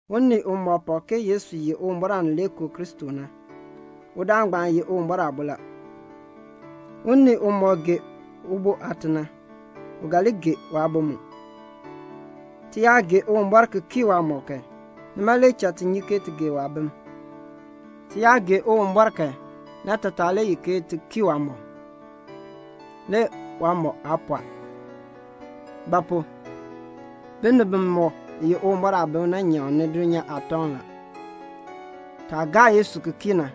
Unii umɔk pak ke Yesu ye Uwumbɔr Aanileekoo Kristo na, udaan ngbaan ye Uwumbɔr aabo la. Unii umɔk gee ubo aate na, u ga li gee waabo mu. Ti yaa gee Uwumbɔr ki kii waamɔb kan, nima le cha ti nyi ke ti gee waabim. Ti yaa gee Uwumbɔr kan, naatataa le ye ke ti kii waamɔb. Le waamɔb aa pɔɔ. Ba pu? binib bimɔk ye Uwumbɔr aabim na nyaŋni dulnyaa aatɔŋ la. Taah gaa Yesu ki kii na,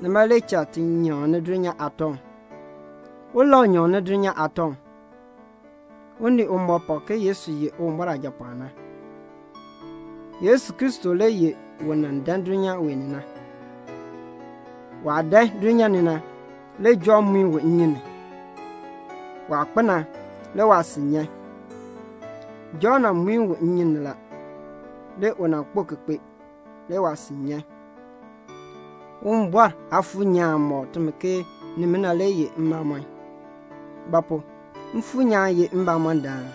nima le cha ti nyaŋni dulnyaa aatɔŋ. Ulau nyaŋni dulnyaa aatɔŋ? Unii umɔk pak ke Yesu ye Uwumbɔr Aajapɔɔn na. Yesu Kristo le ye un nan dan dulnyaa wee ni na. Waah dan dulnyaa ni na, le Jɔnn muin u nnyun ni. Waah kpo na, le waasin nyan. Jɔnn nan muin u nnyun ni la. Le u nan kpo ki kpee, le waasin nyan. Uwumbɔr Aafuur nyaan mɔk timi ke nimina ye mbamɔn la; ba pu? Mfuur nyaan ye mbamɔndaan.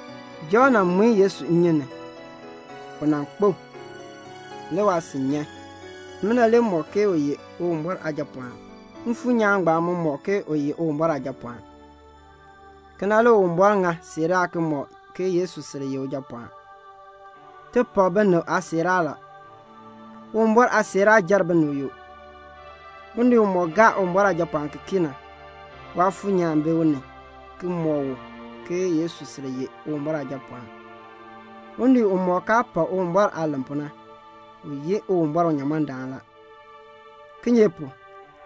Jɔnn nan muin Yesu nnyun ni. U nan kpo, le waasin nyan. Nimina le mɔk ke u ye Uwumbɔr Aajapɔɔn. Mfuur nyaan ngbaan mu mɔk ke u ye Uwumbɔr Aajapɔɔn. Kena le Uwumbɔr ŋa siiraa ki mɔk ke Yesu sil ye Ujapɔɔn. Ti pak binib aasiiraa la. Uwumbɔr aasiiraa jer binib yoo. Unii umɔk gaa Uwumbɔr Aajapɔɔn ki kii na, Waafuur nyaan bi u ni ki mɔk u ke Yesu sil ye Uwumbɔr Aajapɔɔn. Unii umɔk kaa pak Uwumbɔr aah len pu na, u yi Uwumbɔr unyamɔndaan la; kinye pu?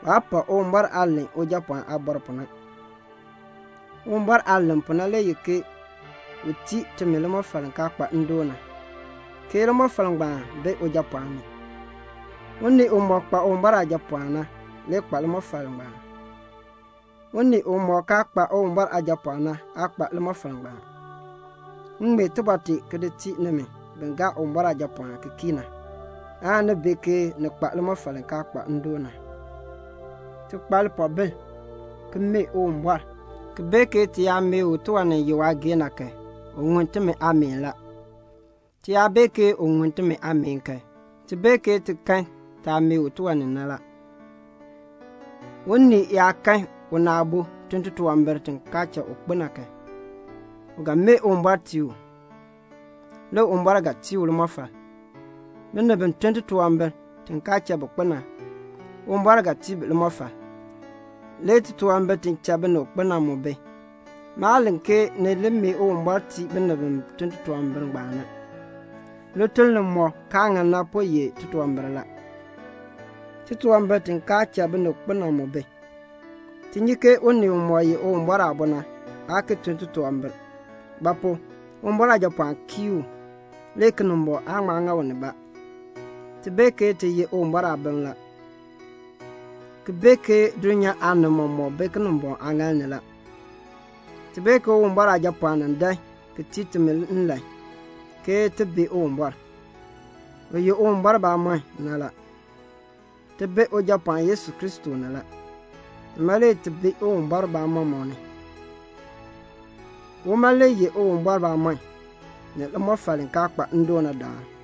waa pak Uwumbɔr aah len Ujapɔɔn aabɔr pu na. Uwumbɔr aah len pu na le ye ke u tii timi limɔfal li kaa kpa ndoon na, ke limɔfal ngbaan bi Ujapɔɔn ni. Unii umɔk kpa Uwumbɔr Aajapɔɔn na le kpa limɔfal ngbaan. Unii umɔk kaa kpa Uwumbɔr Aajapɔɔn na aa kpa limɔfal ngbaan. M ŋmee tibɔr tee ki di tii nimi bi gaa Uwumbɔr Aajapɔɔn ki kii na, aan ni bee ke ni kpa limɔfal li kaa kpa ndoon na. Ti kpa lipoobil ki mee Uwumbɔr ki bee ke ti yaa mee u tiwan ni ye waageehn na kan, u ŋun timi aameen la. Ti yaa bee ke u ŋun timi aameen kan, ti bee ke ti kan taah mee u tiwan ni na la. Unii yaa kan una aabo tun titunwambir ti kaan cha u kpo na kan, u ga mee Uwumbɔr tii u. Le Uwumbɔr ga tii u limɔfal. Binib bi tun titunwambir ti kaan cha bi kpo na, Uwumbɔr ga tii bi limɔfal. Le titunwambir ti cha binib kpo na mu bi. Maa len ke ni li mee Uwumbɔr tii binib bi tun titunwambir ngbaan na. Lituln limɔk kaa ŋan na po ye titunwambir la. Titunwambir ti kaan cha binib kpo na mu bi. Ti nyi ke unii umɔk ye Uwumbɔr aabo na aa ki tun titunwambir; ba pu? Uwumbɔr Aajapɔɔn kii u, le Kinimbɔŋ aan ŋma ŋa u nibaa. Ti bee ke ti ye Uwumbɔr aabim la, ki bee ke dulnyaa aanib mɔmɔk bi Kinimbɔŋ aaŋaal ni la. Ti bee ke Uwumbɔr Aajapɔɔn nan dan ki tii timi nlan ke ti bee Uwumbɔr, u ye Uwumbɔr bamɔnn na la. Ti bi Ujapɔɔn Yesu Kristo ni la, nima le ti bi Uwumbɔr bamɔnn mu ni. Uma le ye Uwumbɔr bamɔnn, ni limɔfal li kaa kpa ndoon na daan.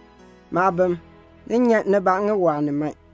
Maabim, ni nyan nibaa ŋiwaa ni man.